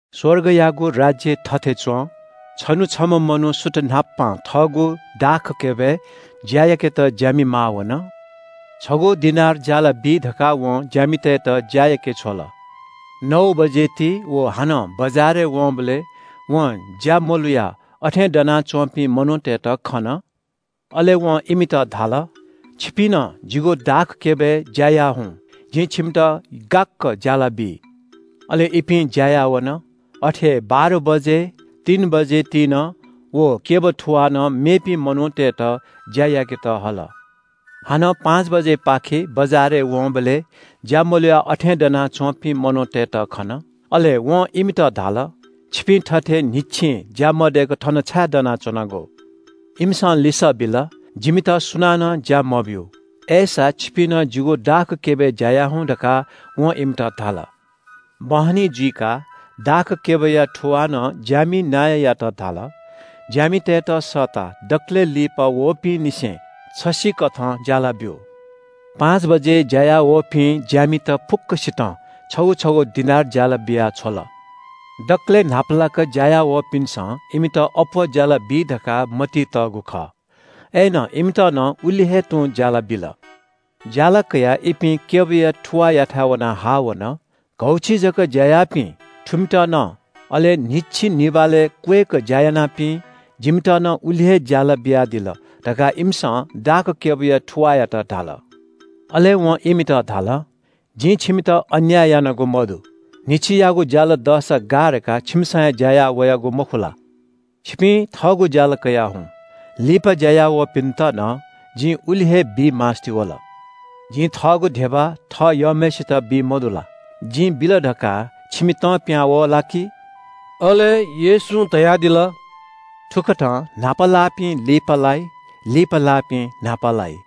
“स्‍वर्गयागु राज्‍य थथे च्‍वं – छन्‍हु छम्‍ह मनू सुथ न्‍हापां थःगु दाखक्‍यबय् ज्‍या याकेत ज्‍यामि माः वन। छगू दिनार ज्‍यालाबी धकाः वं ज्‍यामितय्‌त ज्‍या याके छ्वल। “नौ बजे ति व हानं बजारय् वंबलय् वं ज्‍या मलुयाः अथें दनाच्‍वंपिं मनूतय्‌त खन। अले वं इमित धाल – ‘छिपिं नं जिगु दाखक्‍यबय् ज्‍या याः हुँ। जिं छिमित गाक्‍क ज्‍यालाबी।’ अले इपिं ज्‍या याः वन। “अथे हे बाह्र बजे, तीन बजे ति नं व क्‍यब थुवालं मेपिं मनूतय्‌त ज्‍या याकेत हल। हानं पाँच बजेपाखे बजारय् वंबलय् ज्‍या मलुयाः अथें दनाच्‍वंपिं मनूतय्‌त खन। अले वं इमित धाल – ‘छिपिं थथे न्‍हिच्‍छि ज्‍या मदय्‌क थन छाय् दनाच्‍वनागु?’ “इमिसं लिसः बिल – ‘जिमित सुनानं ज्‍या मब्‍यू।’ “‘अय्‌सा, छिपिं नं जिगु दाखक्‍यबय् ज्‍या याः हुँ’ धकाः वं इमित धाल। “बहनी जुइकाः दाखक्‍यबया थुवालं ज्‍यामि नायःयात धाल – ‘ज्‍यामितय्‌त सःताः दकलय् लिपा वःपिंनिसें छसिकथं ज्‍याला ब्‍यु।’ पाँच बजे ज्‍यायावःपिं ज्‍यामित फुक्‍कसितं छगू छगू दिनार ज्‍याला बियाछ्वल। दकलय् न्‍हापालाक ज्‍या याः वःपिन्‍सं इमित अप्‍वः ज्‍यालाबी धकाः मतिइ तःगु खः। अय्‌नं इमित नं उलि हे तुं ज्‍याला बिल। ज्‍याला कयाः इपिं क्‍यबया थुवाःयाथाय् वनाः हाः वन। ‘घौछि जक ज्‍या याःपिं, थुमित नं, अले न्‍हिच्‍छि निभालय् क्‍वय्‌क ज्‍या यानापिं, जिमित नं उलि हे ज्‍याला बियादिल’ धकाः इमिसं दाखक्‍यबया थुवाःयात धाल। “अले वं इमित धाल – ‘जिं छिमित अन्‍याय यानागु मदु। न्‍हिच्‍छियागु ज्‍याला दःसा गाः धकाः छिमिसं हे ज्‍या याः वयागु मखु ला? छिपिं थःगु ज्‍याला कयाः हुँ। लिपा ज्‍या याःवःपिन्‍त नं जि उलि हे बी मास्‍ति वल। जिं थःगु धिबा थः यःम्‍हय्‌सित बी मदु ला? जिं बिल धकाः छिमि तं पिहां वः ला कि?’” अले येशूं धयादिल – “थुकथं न्‍हापा लाःपिं लिपालाइ, लिपा लाःपिं न्‍हापा लाइ।”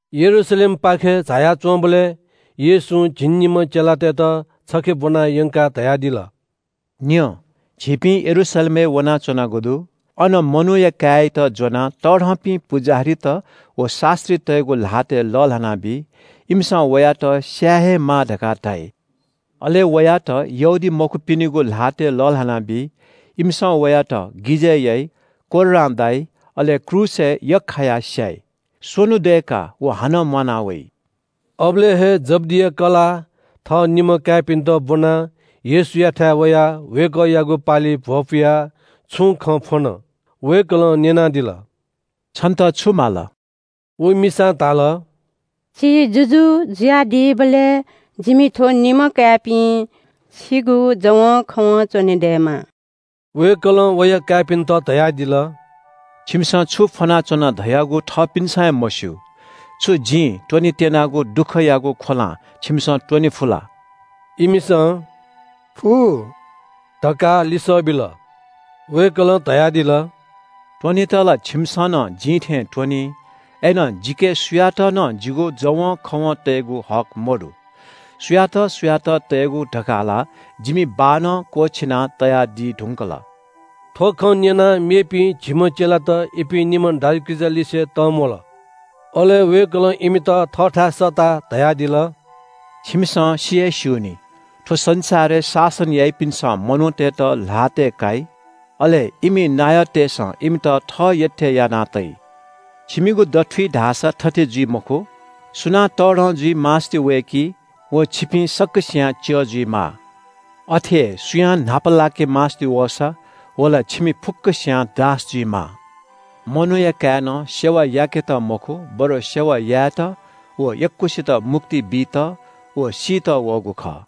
यरूशलेमपाखे झाया च्‍वंबलय् येशूं झिंनिम्‍ह चेलातय्‌त छखे ब्‍वना यंकाः धयादिल। “न्‍यँ, झीपिं यरूशलेमय् वनाच्‍वनागु दु। अन मनूया काय्‌यात ज्‍वनाः तःधंपिं पुजाहारीत व शास्‍त्रीतय्‌गु ल्‍हातय् लःल्‍हानाबी। इमिसं वयात स्‍याये हे माः धकाः धाइ। अले वयात यहूदीमखुपिनिगु ल्‍हातय् लःल्‍हानाबी। इमिसं वयात गिजय् याइ, कोर्रां दाइ, अले क्रूसय् यख्‍खायाः स्‍याइ। स्‍वन्‍हु दय्‌काः व हानं म्‍वाना वइ।” अबलय् हे जब्‍दिया कलाः थः निम्‍ह काय्‌पिन्‍त ब्‍वनाः येशूयाथाय् वयाः वय्‌कःयागु पालिइ भ्‍वपुयाः छुं खँ फ्‍वन। वय्‌कलं न्‍यनादिल – “छन्‍त छु माल?” व मिसां धाल – “छि जुजु जुयादीबलय् जिमि थ्‍व निम्‍ह काय्‌पिं छिगु जवंखवं च्‍वनेदयेमा।” वय्‌कलं वया काय्‌पिन्‍त धयादिल, “छिमिसं छु फ्‍वनाच्‍वना धयागु थःपिन्‍सं हे मस्‍यू। छु जिं त्‍वनेत्‍यनागु दुःखयागु ख्‍वलां छिमिसं त्‍वने फु ला?” इमिसं “फु” धकाः लिसः बिल। वय्‌कलं धयादिल – “त्‍वनेत ला छिमिसं नं जिं थें त्‍वनी। अय्‌नं जिके सुयात नं जिगु जवंखवं तयेगु हक मदु। सुयात सुयात तयेगु धकाः ला जिमि बाःनं क्‍वःछिना तयादी धुंकल।” थ्‍व खँ न्‍यनाः मेपिं झिम्‍ह चेलात इपिं निम्‍ह दाजुकिजा लिसे तंम्‍वल। अले वय्‌कलं इमित थःथाय् सःताः धयादिल – “छिमिसं सि हे स्‍यू नि – थ्‍व संसारय् शासन याइपिन्‍सं मनूतय्‌त ल्‍हातय् काइ। अले इमि नायःतय्‌सं इमित थः यःथें याना तइ। छिमिगु दथुइ धाःसा थथे जुइ मखु। सुनां तःधं जुइ मास्‍ति वय्‌की व छिपिं सकसियां च्‍यः जुइमाः। अथे हे सुयां न्‍हापालाके मास्‍ति वःसा व ला छिमि फुक्‍कसियां दास जुइमाः। मनूया काय्‌नं सेवा याकेत मखु, बरु सेवा यायेत व यक्‍वसित मुक्ति बीत व सीत वःगु खः।”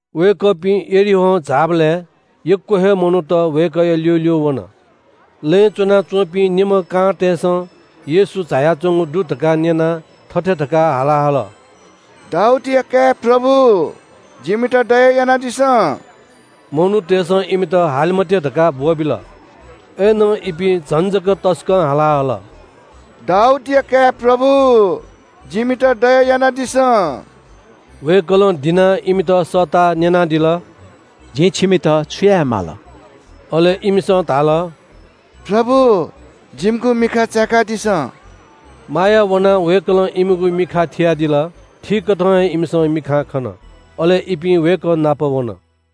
वय्‌कःपिं यरीहों झाःबलय् यक्‍व हे मनूत वय्‌कःया ल्‍यूल्‍यू वन। लँय् च्‍वनाच्‍वंपिं निम्‍ह कांतय्‌सं येशू झायाच्‍वंगु दु धकाः न्‍यनाः थथे धकाः हाला हल – “दाऊदया काय् प्रभु, जिमित दया यानादिसँ।” मनूतय्‌सं इमित हाले मते धकाः ब्‍वःबिल। अय्‌नं इपिं झन जक तसकं हाला हल – “दाऊदया काय् प्रभु, जिमित दया यानादिसँ।” वय्‌कलं दिनाः इमित सःताः न्‍यनादिल – “जिं छिमित छु याये माल?” अले इमिसं धाल – “प्रभु, जिमिगु मिखा चाय्‌कादिसँ।” माया वनाः वय्‌कलं इमिगु मिखाय्‌ थियादिल। थीकथं हे इमिसं मिखां खन। अले इपिं वय्‌कः नाप वन।